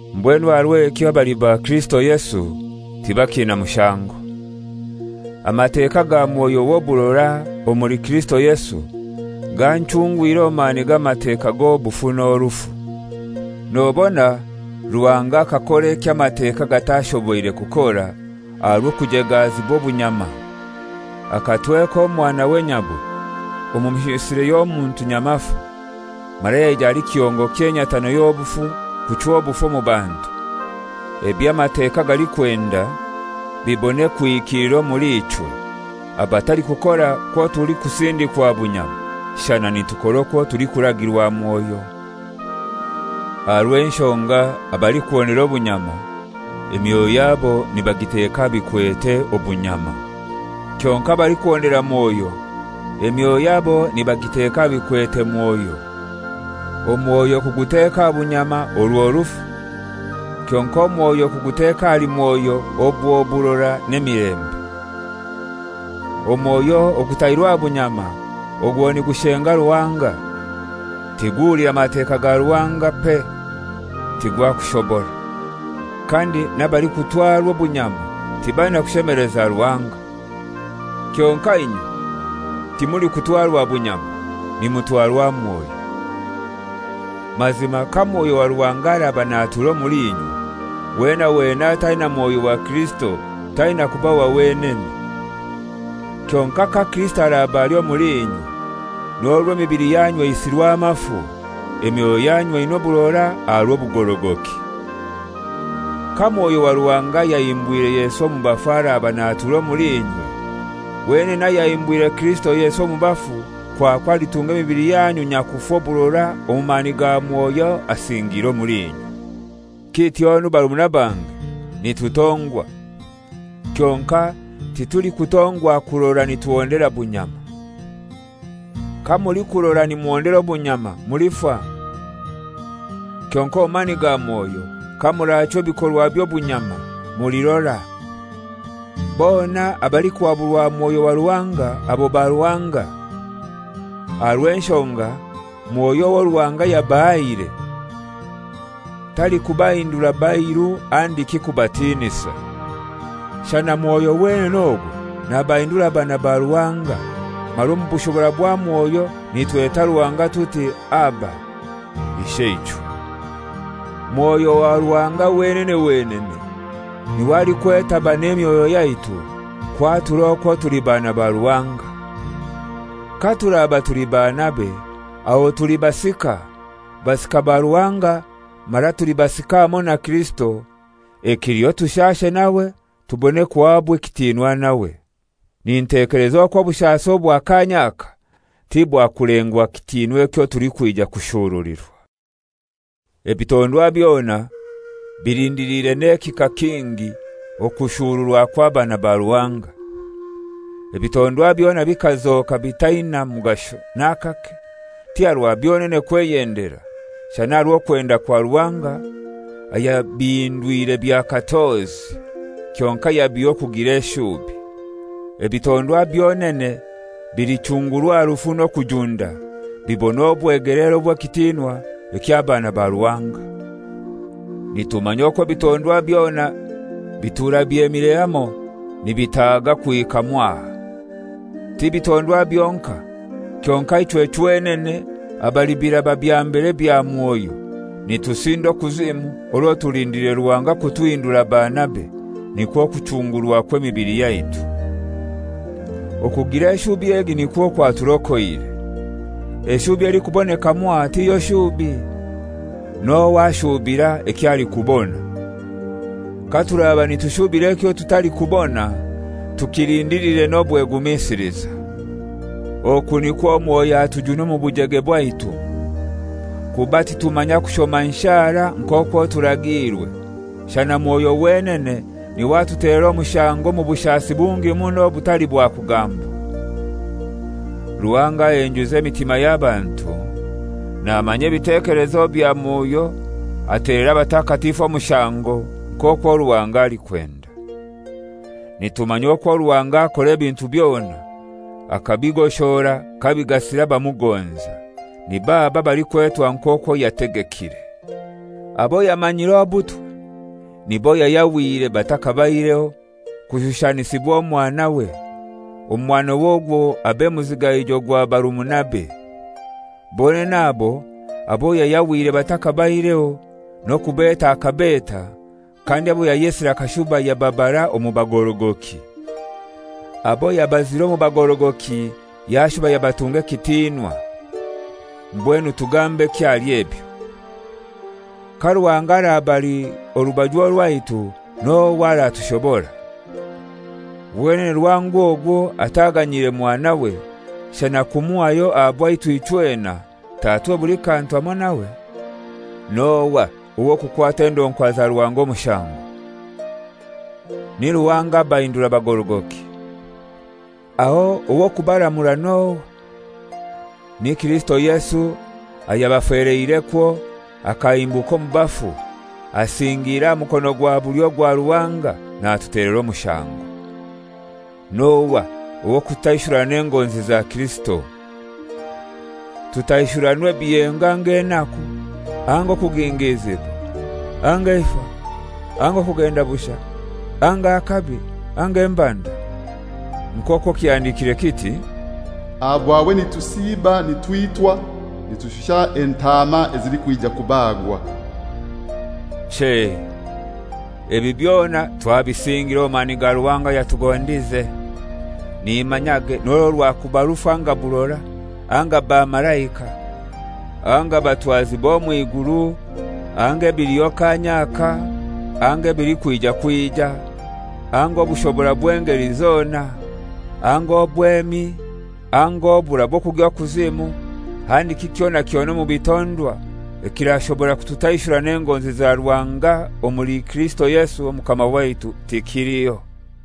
Mbwenu aha rw'ekyo abali ba Kirisito Yesu tibakiina mushango. Amateka ga Mwoyo w'oburora omuli Kirisito Yesu ganchungwire omu mani g'Amateka g'obufu n'orufu. Nobona Ruhanga akakora eky'Amateka gatashoboire kukora aha rw'okujegaazibwa obunyama. Akatweka Omwanawe nyabwe omu mishusire y'omuntu nyamafu, mara yaija ali kihongo ky'enyatano y'obufu kuchwa obufu omu bantu, eby'Amateka galikwenda bibone kuhikilira omuli ichwe abatalikukora kwo tulikusindikwa bunyama shana nitukora okwo tulikuragirwa Mwoyo. Aha rw'enshonga abalikuhondera obunyama emyoyo yabo nibagiteka aha bikwete obunyama. Kyonkai abalikuhondera Mwoyo emyoyo yabo nibagiteka aha bikwete Mwoyo. Omwoyo kuguteka aha bunyama orwo rufu, kyonkai omwoyo kuguteka ahali Mwoyo obwo burora n'emilembe. Omwoyo ogutairwe aha bunyama ogwo nigushenga Ruhanga; tiguhulira Mateka ga Ruhanga, pe tigwakushobora. Kandi n'abalikutwarwa obunyama tibaina kushemeleza Ruhanga. Kyonkai inywe timulikutwarwa bunyama, nimutwarwa Mwoyo. Mazima ka Mwoyo wa Ruhanga araba natura omuli inywe, wena wena ataina Mwoyo wa Kirisito taina kuba wa wenene. Kyonkai ka Kirisito araba ali omuli inywe, n'orwo emibili yanyu eisirwe amafu, emyoyo yanyu eina oburora aha rw'obugorogoki. Ka Mwoyo wa Ruhanga ayahimbwire Yesu omu bafu araba natura omuli inywe, wenene ayahimbwire Kirisito Yesu omu bafu kwakwo alitunga emibili yanyu nyakufa oburora omu mani ga Mwoyo asingiire omuli inywe. Kityonu barumuna bange, nitutongwa, kyonkai titulikutongwa kurora nituhondera bunyama. Kamulikurora nimuhondera obunyama mulifa, kyonkai omu mani ga Mwoyo kamurachwa ebikorwa by'obunyama mulirora. Bona abalikuhaburwa Mwoyo wa Ruhanga abo ba Ruhanga. Aha rw'enshonga Mwoyo owo Ruhanga yabahaire talikubahindura bairu handiki kubatinisa; shana Mwoyo wenene ogwo nabahindura baana ba Ruhanga, mara omu bushobora bwa Mwoyo nitweta Ruhanga tuti, «Aba! Isheichwe!» Mwoyo wa Ruhanga wenene wenene n'iwe alikwetaba n'emyoyo yaitu kwatura okwo tuli baana ba Ruhanga. Katuraba tuli baanabe, aho tuli basika, basika ba Ruhanga mara tuli basika hamoi na Kirisito, ekiliho tushaashe nawe tubone kuhabwa ekitinwa nawe. Nintekeleza okwo obushasi obwa kaanya aka tibwakulengwa kitinwa ekyo tulikwija kushurulirwa. Ebitondwa byona bilindilire n'ekihika kingi okushuruwa kw'abaana ba Ruhanga. Ebitondwa byona bikazoka bitaina mugasho n'akake, ti aha rwa byonene kweyendera, shana aha rw'okwenda kwa Ruhanga ayabahindwire bya katozi, kyonkai yabiha okugira eshubi. Ebitondwa byonene bilichungurwa aha rufu n'okujunda bibone obwegeleere obw'ekitinwa eky'abaana ba Ruhanga. Nitumanya okwo ebitondwa byona bitura byemire hamoi nibitaaga kuhika mwaha. Ti bitondwa byonkai, kyonkai ichwe chwenene abali biraba bya mbere bya Mwoyo, nitusinda okuzimu orwo tulindiliire Ruhanga kutuhindura baanabe, nikwo kuchungurwa kw'emibili yaitu. Okugira eshubi egi nikwo kwaturokoire. Eshubi elikuboneka mwaha tiyo shubi. N'ohai ashubira eky'alikubona? Katuraba nitushubira ekyo tutalikubona, tukilindilire n'obwegumisiliza. Oku nikwo Mwoyo atujuna omu bujege bwaitu. Kuba titumanya kushoma nshara nk'okwo turagiirwe, shana Mwoyo wenene n'iwe atutelera omushango omu bushasi bungi muno obutali bwa kugambwa. Ruhanga ahenjuza emitima y'abantu namanya ebitekelezo bya Mwoyo atelera abatakatifu omushango nk'okwo Ruhanga alikwenda. Nitumanya okwo Ruhanga akora ebintu byona akabigoshora kabigasira abamugonza, nib'abo abalikwetwa nk'okwo yategekire. Abo yamanyire obutwe nibo yayahwire batakabaireho kushushanisibwa Omwanawe, Omwanawe ogwo abe muzigaijo gwa barumunabe. Bonene abo, abo yayahwire batakabaireho n'okubeta akabeta, kandi abo yayesire akashuba yababara omu bagorogoki; abo yabazire omu bagorogoki yashuba yabatunga ekitinwa. Mbwenu tugambeki ahali ebyo? Ka Ruhanga araba ali orubaju rwaitu n'ohai aratushobora? Wenene Ruhanga ogwo ataganyiire Mwanawe, shana kumuhayo aha bwaitu ichwena, tatuhe buli kantu hamoi nawe? N'ohai ow'okukwata endonkwa za Ruhanga omushango? Ni Ruhanga abahindura bagorogoki! Aho ow'okubaramura n'ohai? Ni Kirisito Yesu ayabafeleirekwo, akahimbuka omu bafu, asingiire aha mukono gwa bulyo gwa Ruhanga natutelera omushango. N'ohai ow'okututaishurana n'engonzi za Kirisito? Tutaishuranwe ebiyengo anga enaku, anga okugingiizibwa, anga eifa, anga okugenda bushai, anga akabi, anga embanda? Nk'okwo kihandikire kiti, «Aha bwawe nitusiiba nitwitwa; nitushusha entaama ezilikwija kubagwa.» Chei, ebi byona twabisingire omu mani ga Ruhanga ayatugondize. Nimanyage n'orwo rwakuba rufu anga burora, anga bamalaika, anga batwazi b'omw'iguru, anga ebiliho kaanya aka, anga ebilikwija kwija, anga obushobora bw'engeli zona, anga obwemi, anga oburai bw'okugya okuzimu, handiki kyona kyona omu bitondwa, ekirashobora kututaishurana n'engonzi za Ruhanga omuli Kirisito Yesu Omukama waitu tikiliho.